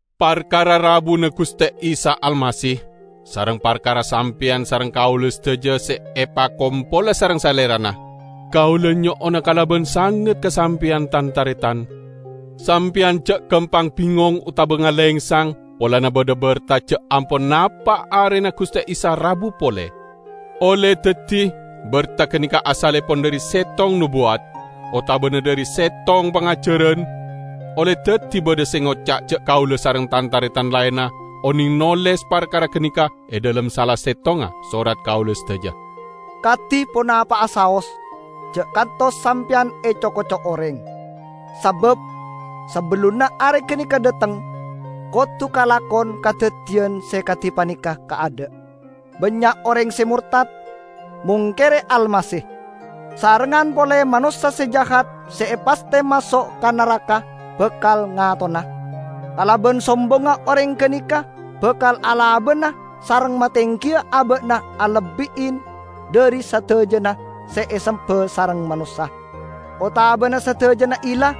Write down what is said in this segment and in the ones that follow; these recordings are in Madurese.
Parkara rabuna Guste Isa Almasih, sareng parkara sampeyan sareng kaula sadaja se epakompola sareng Salerana, kaula nyo'ona kalaban sanget ka sampeyan, tan-taretan: Sampeyan ja' gampang bingong otaba ngalengsang polana badha berta ja' ampon napa' arena Guste Isa rabu pole. Olle daddi berta ganeka asallepon dhari settong nobuwat, otabana dhari settong pangajaran; olle daddi badha se ngoca' ja' kaula sareng tan-taretan laenna oneng noles parkara ganeka e dhalem sala settonga sorat kaula sadaja. Kadi ponapa'a saos, ja' kantos sampeyan eco-koco oreng. Sabab sabellunna Are ganeka dhateng, kodu kalakon kadaddiyan se kadi paneka kaadha': Bannya' oreng se mortad, mongkere Almasih; sarengngan pole Manossa Se Jahat se epasthe maso' ka naraka, bakal ngatona. Kalaban sombongnga oreng ganeka bakal alabana sareng matenggiya aba'na alebbi'i dhari sadajana se esemba sareng manossa, otabana sadajana illah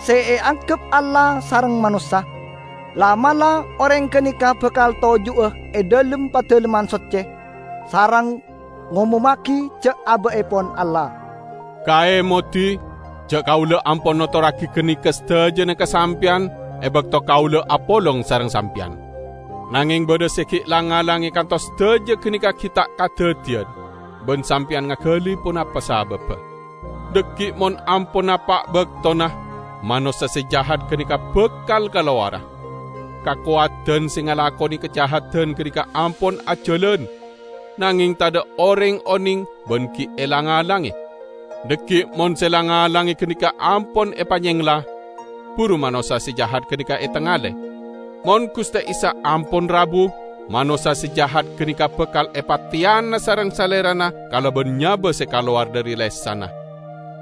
se eanggep Allah sareng manossa. La'-mala' oreng ganeka bakal toju'a e dhalem Padalemman Socce sareng ngomommagi ja' aba'epon Allah. Kaemodi, ja' kaula ampon notorragi ganeka sadajana ka sampeyan e bakto kaula apolong sareng sampeyan. Nangeng badha se gi' lang-ngalange kantos sadaja ganeka gi' ta' kadaddiyan, ban sampeyan ngagali ponapa sababba. Dhaggi' mon ampon napa' baktona, Manossa Se Jahat ganeka bakal kalowara. Kakowadan se ngalakone kajahadan ganeka ampon ajalan, nangeng tadha' oreng oneng ban gi' elang-alange. Dhaggi' mon se lang-ngalange ganeka ampon epanyengla, buru Manossa Se Jahat ganeka etengale. Mon Guste Isa ampon rabu, Manossa Se Jahat ganeka bakal epateyana sareng Salerana kalaban nyaba se kalowar dhari lesanna,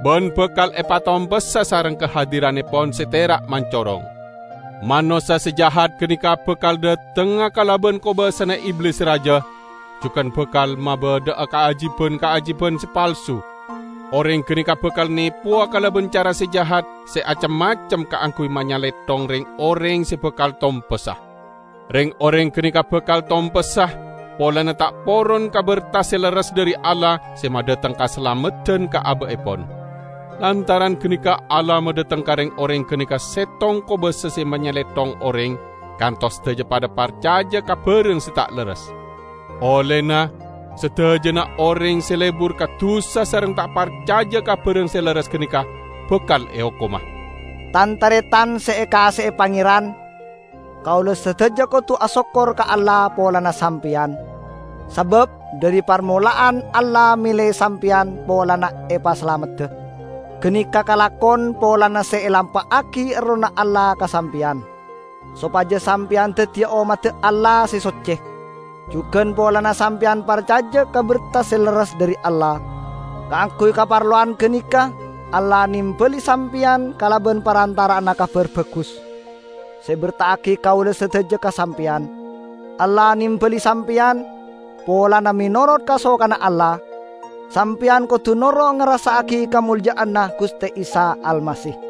ban bakal epatompessa sareng kahadirannepon se tera' mancorong. Manossa Se Jahat ganeka bakal dhatengnga kalaban kobasana Iblis se raja, jugan bakal mabadha'a kaajiban-kaajiban se palsu. Oreng ganeka bakal nepowa kalaban cara se jahat se acem-macem kaangguy manyalethong reng-oreng se bakal tompessa. Reng-oreng ganeka bakal tompessa polana ta' poron ka berta se lerres dhari Allah se madhateng kasalameddan ka aba'epon. Lantaran ganeka Allah madhateng ka reng-oreng ganeka settong kobasa se manyalethong oreng, kantos sadaja padha parcaja ka barang se ta' lerres. Ollena, sadajana oreng se lebur ka dusa sareng ta' parcaja ka barang se lerres ganeka bakal eokoma. Tan-taretan se ekaase'e Pangeran! Kaula sadaja kodu asokkor ka Allah polana sampeyan, sabab dhari parmola'an Allah mele sampeyan polana epasalamedda. Ganeka kalakon polana se elampa'agi Errohna Allah ka sampeyan, sopaja sampeyan daddiya ommadda Allah se socce, jugan polana sampeyan parcaja ka berta se lerres dhari Allah. Kaangguy kaparlowan ganeka Allah nembali sampeyan kalaban parantara'anna Kabar Bagus se eberta'agi kaula sadaja ka sampeyan. Allah nembali sampeyan, polana menorot kasokanna Allah sampeyan kodu noro' ngarassa'agi kamolja'anna Guste Isa Almasih.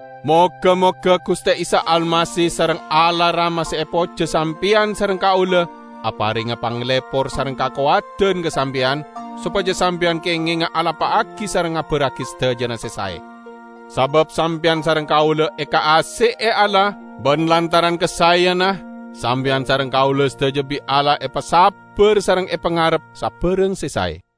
Moga-moga Guste Isa Almasih sareng Allah Rama se epojja sampeyan sareng kaula aparenga panglepor sareng kakowadan ka sampeyan, sopaja sampeyan kengenga alampa'agi sareng ngabarragi sadajana se sae. Sabab sampeyan sareng kaula ekaase'e Allah, ban lantaran kasaeyanna, sampeyan sareng kaula sadaja bi' Allah epasabbar sareng epangarep sabarang se sae.